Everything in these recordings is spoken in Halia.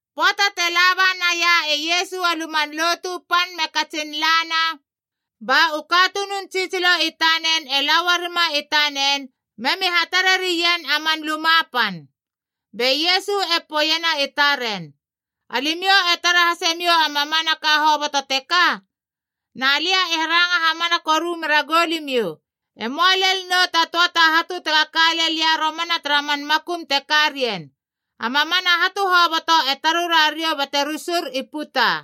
Pöata te laba naia e Iesu a Luman Lotu Pan me katsin lana, ba u katunun tsitsilo i tanen e la uarima i tanen memi hatare rien a man luma pan. Be Iesu e poeiena i taren “Alimiou e tara hasemiou a mamanaka hoboto teka. Na lia e ranga hamana koru mera goulimiou, e möa lel nou ta töa ta hatu tega ka lel ia romana tara man makum te karien. A mamana hatu hoboto e tarura riou bate rusur i puta.”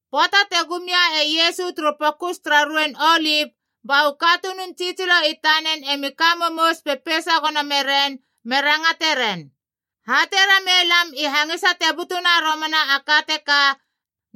Pöata te gum ia e Iesu turu Pokus tara Ruein Olip ba u katunun tsitsilo i tanen emi ka momous pepeisa gono meren me rangate ren, “Hatei ramei lam i hangisa te butuna romana a ka teka,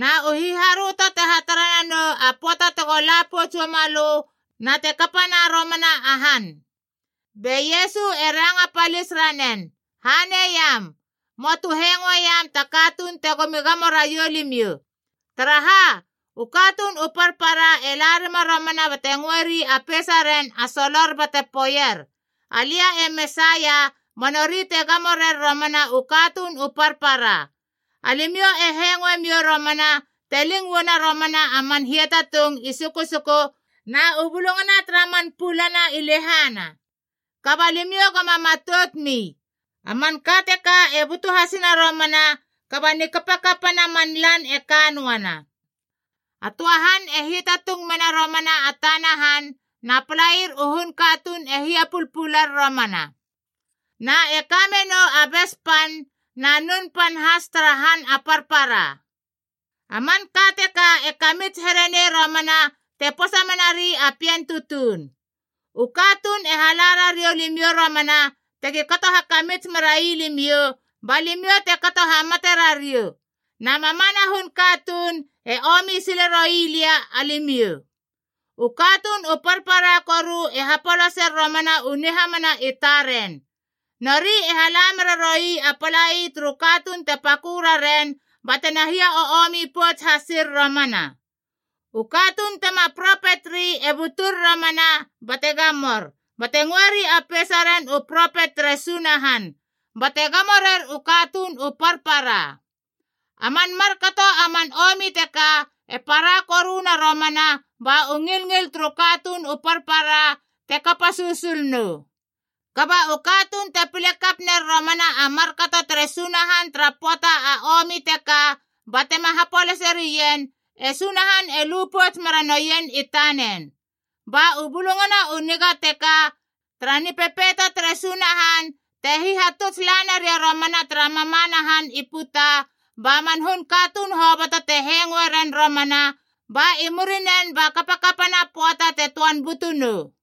na u hiharöto te hatara nanou a pöata tego la pouts uama lö, na te kapana romana a han.” Be Iesu e ranga palis ranen, “Haneiam, möa tu hengoeiam ta katuun tegomi gamo raiou limiou. Taraha, u katuun u parpara e la rima romana bate ngöeri a peisaren a solor bate poeier, ‘Alia e Mesaia’ ba nori te gamo rer romana u katuun u parpara. Alimiou e hengoemiou romana te ling uana romana a man hiatatung i susuku na u bulungana tara man pulana i lehana. Kaba limiou goma matout mi. A manka teka e butu hasina romana, kaba a nikapakapa na man lan e ka noana. A töa han e hiatatung mena romana a tana han, na palair u hun katuun e hiapulpular romana. Na e kamenou a bes pan na nun pan has tara han a parpara. A manka teka e kamits here nei romana te posa menari a pien tutuun. “U katuun e hala rariou limiou romana tegi kato hakamits merai limiou, ba limiou te kato hamate rariou. Na mamana hun katuun e omi sile roi lia, alimiou. U katuun u parpara koru e hapolaser romana u nihamana i taren. Nori e hala mera roi a palai turu katuun te pakö raren batena hia o omi pouts hasir romana. U katuun tema propet ri e butur romana bate gamour, bate ngöeri a peisaren u propet tere Sunahan, bate gamo rer u katuun u parpara. A man markato a man omi teka e para koruna romana ba u ngilngil turu katuun u parpara te kapa susul nou. Kaba u katuun te pile kap ner romana a markato tere Sunahan tara pöata a omi teka batema hapolaserien, e Sunahan e lu pouts mera noien i tanen. Ba u Bulungana u Niga teka tara Nipepeito tere Sunahan te hihatuts laneria romana tara mamana han i puta, ba man hun katuun hoboto te hengoe ren romana, ba i murinen ba kapakapana a pöata te töan butu nou.”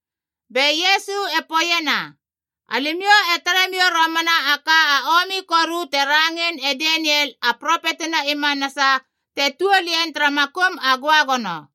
Be Iesu e poeiena, “Alimiou e tare miou romana a ka a omi koru te rangein e Daniel a propetina i manasa, te tuol ien tara makum a göagono.”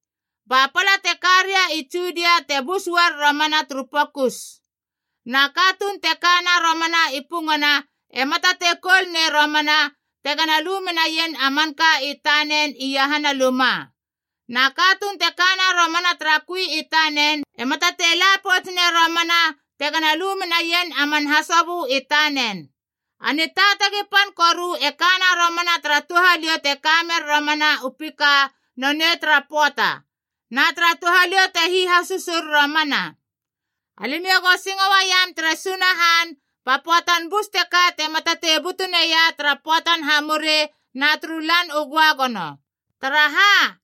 “Ba pala te karia i Judia te bus uar romana turu pokus. Na katuun te kana romana i pungana ema tatei koul nei romana, tegana lu menaien a manka i tanen iahana luma. Na katuun te kana romana tara kui i tanen ema tatei la pouts nei romana tegana lu menaien a man hasobö i tanen. A nitaatagi pan koru e kana romana tara touhaliou te kamer romana u pika nonei tara pöata, na tara touhaliou te hihasusur romana! Alimiou go singo uaiam tere Sunahan ba pöatan bus teka tema tatei butu neia tara pöatan hamuri na turu Lan u Göagono. Taraha,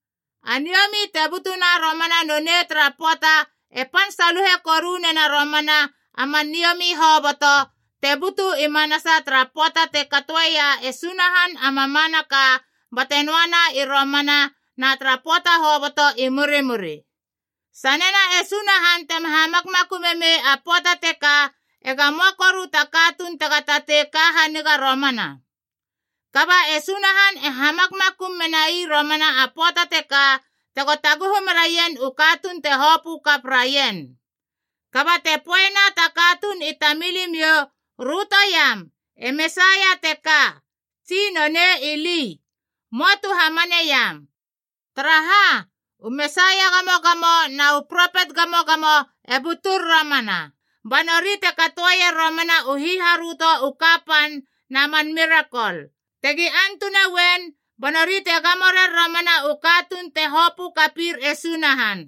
a niomi te butuna romana nonei tara pöata e pan saluhe koru nena romana a man niomi hoboto, te butu i manasa tara pöata te katoeia e Sunahan a mamanaka bate noana i romana na tara pöata hoboto i murimuri. Sanena e Sunahan tema hamakmakumei a pöata teka, ega möa koru ta katuun tega tatei ka haniga romana. Kaba e Sunahan e hamakmakum menai romana a pöata teka tego taguhu meraien u katuun te hopö kap raien. “Kaba te poeiena ta katuun i tamilimiou, ‘Röto iam, e Mesaia teka,’ tsi ‘Nonei ili,’ möa tu hamaneiam. Taraha, u Mesaia gamogamo na u propet gamogamo e butur romana, ba nori te katoer romana u hiharöto u kapan na man mirakol. Tegi antuna uen, ba nori te gamo rer romana u katuun te hopökapir e Sunahan.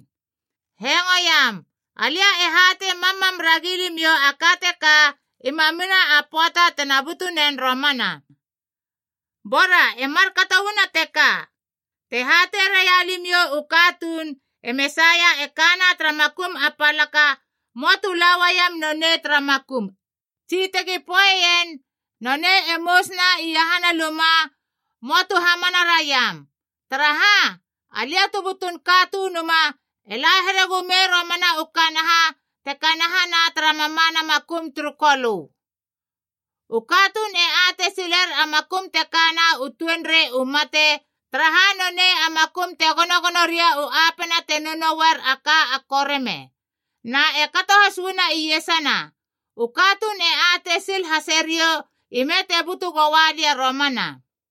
Hengoiam! Alia e hatei mammam ragilimiou a ka teka i mamina a pöata tena butu nen romana. “Bora e markato uana teka, te hatei raia limiou u katuun, ‘E Mesaia e kana tara makum a palaka,’ möa tu la uaiam nonei tara makum. Tsi tegi poeien, ‘Nonei e mousuna iahana luma,’ möa tu hamana raiam. Taraha, Alia tu butun Katunuma e la here gumei romana u kanaha te kanahana tara mamana makum turu kolö. U katuun e atei siler a makum te kana u tuenrei u mate, taraha nonei a makum te gonogono ria u apena te nounouer a ka a koreme. Na e kato has uana iesana, u katuun e atei sil hase riou ime te butu goa lia romana.”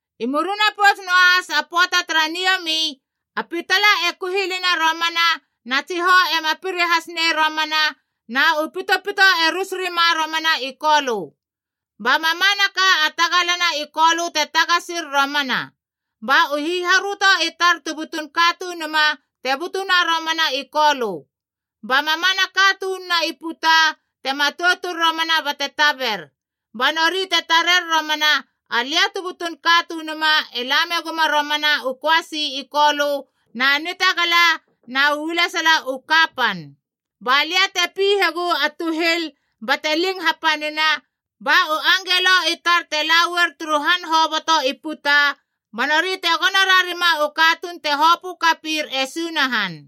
“I murina pouts noahas a pöata tara niomi, a pitala e kuhilina romana, na tsihou ema piri has nei romana, na u pitopito e rus rima romana i kolö. Ba mamanaka a tagala na i kolö te tagasir romana. “Ba u hiharöto i tar tu butun Katunuma te butuna romana i kolö. Ba mamana katununa i puta te matoutur romana bate taber, ba nori te tarer romana Alia tu butun Katunuma e la meguma romana u köasi i kolö na nitagala na u ualesala u kapan. Ba lia te pihegu a tuhil bate ling hapanina, ba u angelo i tar te la uar turu han hoboto i puta, ba nori te gono rarima u katuun te hopö kapir e Sunahan.”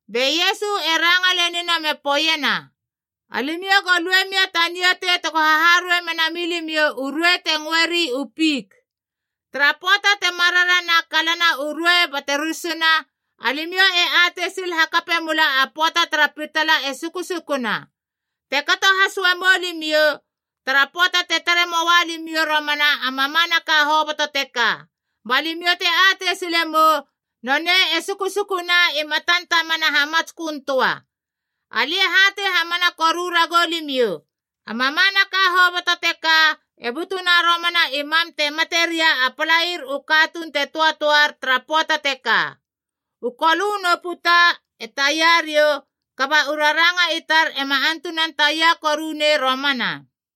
Be Iesu e ranga lenina me poeiena, “Alimiou go lue mia ta niatei tego haharuei mena milimiou u ruei te ngöeri u fik. Tara pöata te mararana a kalana u ruei bate rurusuna, alimiou e atei sil hakape mula a pöata tara pitala e susukuna. Te kato has uamou limiou, tara pöata te tare moa limiou romana a mamanaka hoboto teka, ba limiou te atei sile mou nonei e susukuna i matan tamana hamatskön töa. Alia e hatei hamana koru ragou limiou, a mamanaka hoboto teka e butuna romana i mam te mate ria a palair u katuun te töatöar tara pöata teka. U kolö nu puta e taia riou, kaba u raranga i tar ema antunan taia koru nei romana.”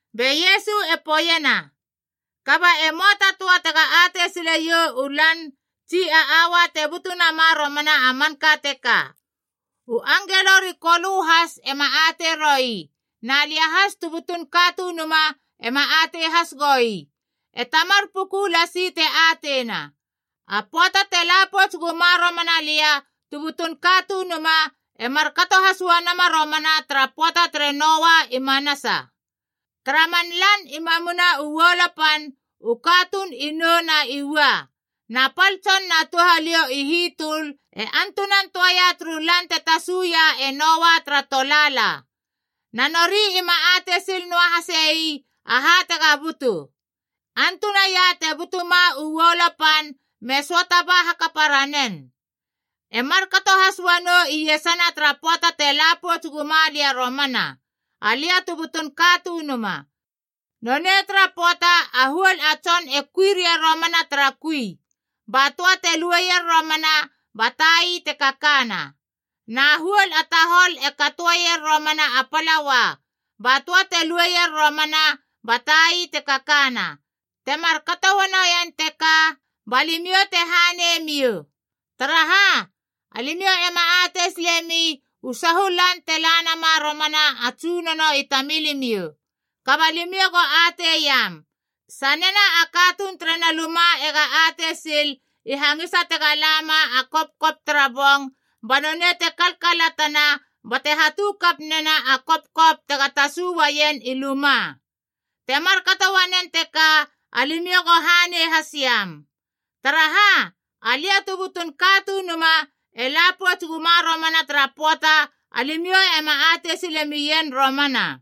Be Iesu e poeiena, “Kaba e möa ta töa tega atei sileiou u lan tsi a aua te butu nama romana a manka teka. U angelo ri Kolö has ema atei roi, na lia has tu butun Katunuma ema atei has goi. E Tamar puku lasi te ateina. A pöata te la pouts guma romana lia tu butun Katunuma e markato has uanama romana tara pöata tere Noa i manasa. Tara man lan i mamina u uolo pan, u katuun i nou na i ua, na pal tson na touhaliou i hitöl e antunan töaia turu lan te tasuia e Noa tara tolaala. Na nori ima atei sil noa hasei aha tega butu. Antunaia te butuma u uolo pan me söata ba hakapa ranen. E markato has uanou iesana tara pöata te la pouts guma lia romana, Alia tu butun Katunuma. Nonei tara pöata a huol a tson e kui ria romana tara kui. Ba töa te lueier romana, ba tai te kakana. Na a huol a tahol e katoeier romana a palaua. Ba töa te lueier romana, ba tai te kakana. Te markato uanoien teka, ba limiou te haneimiou. “Taraha, alimiou ema atei silemi u sahu lan te la nama romana a Tsunono i tamilimiou. Kaba limiou go atei iam: sanena a katuun terena luma ega atei sil i hangisa tega lama a kopkop tara bong, ba nonei te kalkalatana bate hatu kap nena a kopkop tega tasu uaien i luma. Te markato uanen teka alimiou go hanei hasiam. Taraha, Alia tu butun Katunuma e la pouts guma romana tara pöata, alimiou ema atei silemien romana.”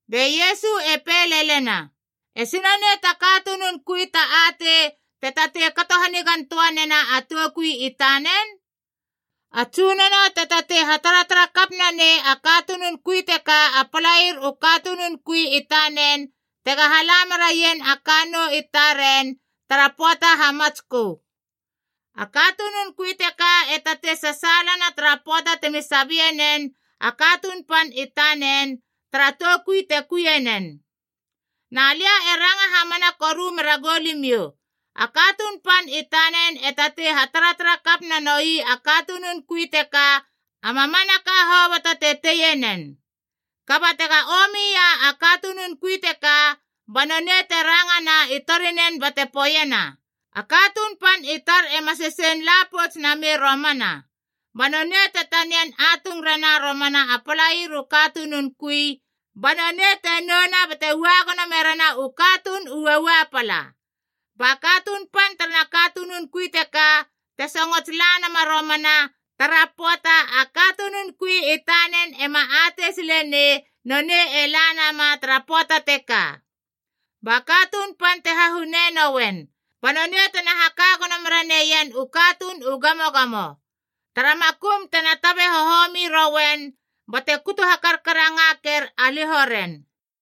Be Iesu e pei lelena, “Esi nonei ta katunun kui ta atei te tatei kato hanigan töa nena a toukui tanen? A Tsunono te tatei hataratara kap nanei a katuun teka a palair u katunun kui i tanen tega hala meraien a kannou i taren tara pöata hamatskö. A katunun kui teka e tatei sasaalana tara pöata temi sabienen a katuun pan i tanen, tara toukui te kuinen. Na lia e ranga hamana koru mera goulimiou, a katuun pan i tanen e tatei hataratara kap nanoi a katunun kui teka a mamanaka hoboto te teie nen. Kaba tega omia a katunun kui teka, ba nonei te rangana i torinen bate poeiena, ‘A katuun pan i tar ema sesein la pouts namei romana.’ Ba nonei te tanian atung rena romana a palair u katunun kui, ba nonei te nouna bate ua gono merena u katuun u uaua pala. Ba katuun pan tara katunun kui teka, te songots la nama romana tara pöata, a katunun kui i tanen ema atei silenei nonei e la nama tara pöata teka. Ba katuun pan te hahune noen, ba nonei tena haka gono mera neien u katuun u gamogamo. Tara makum tena tabe hohomi rouen bate kutu hakarkarangaker a liho ren.”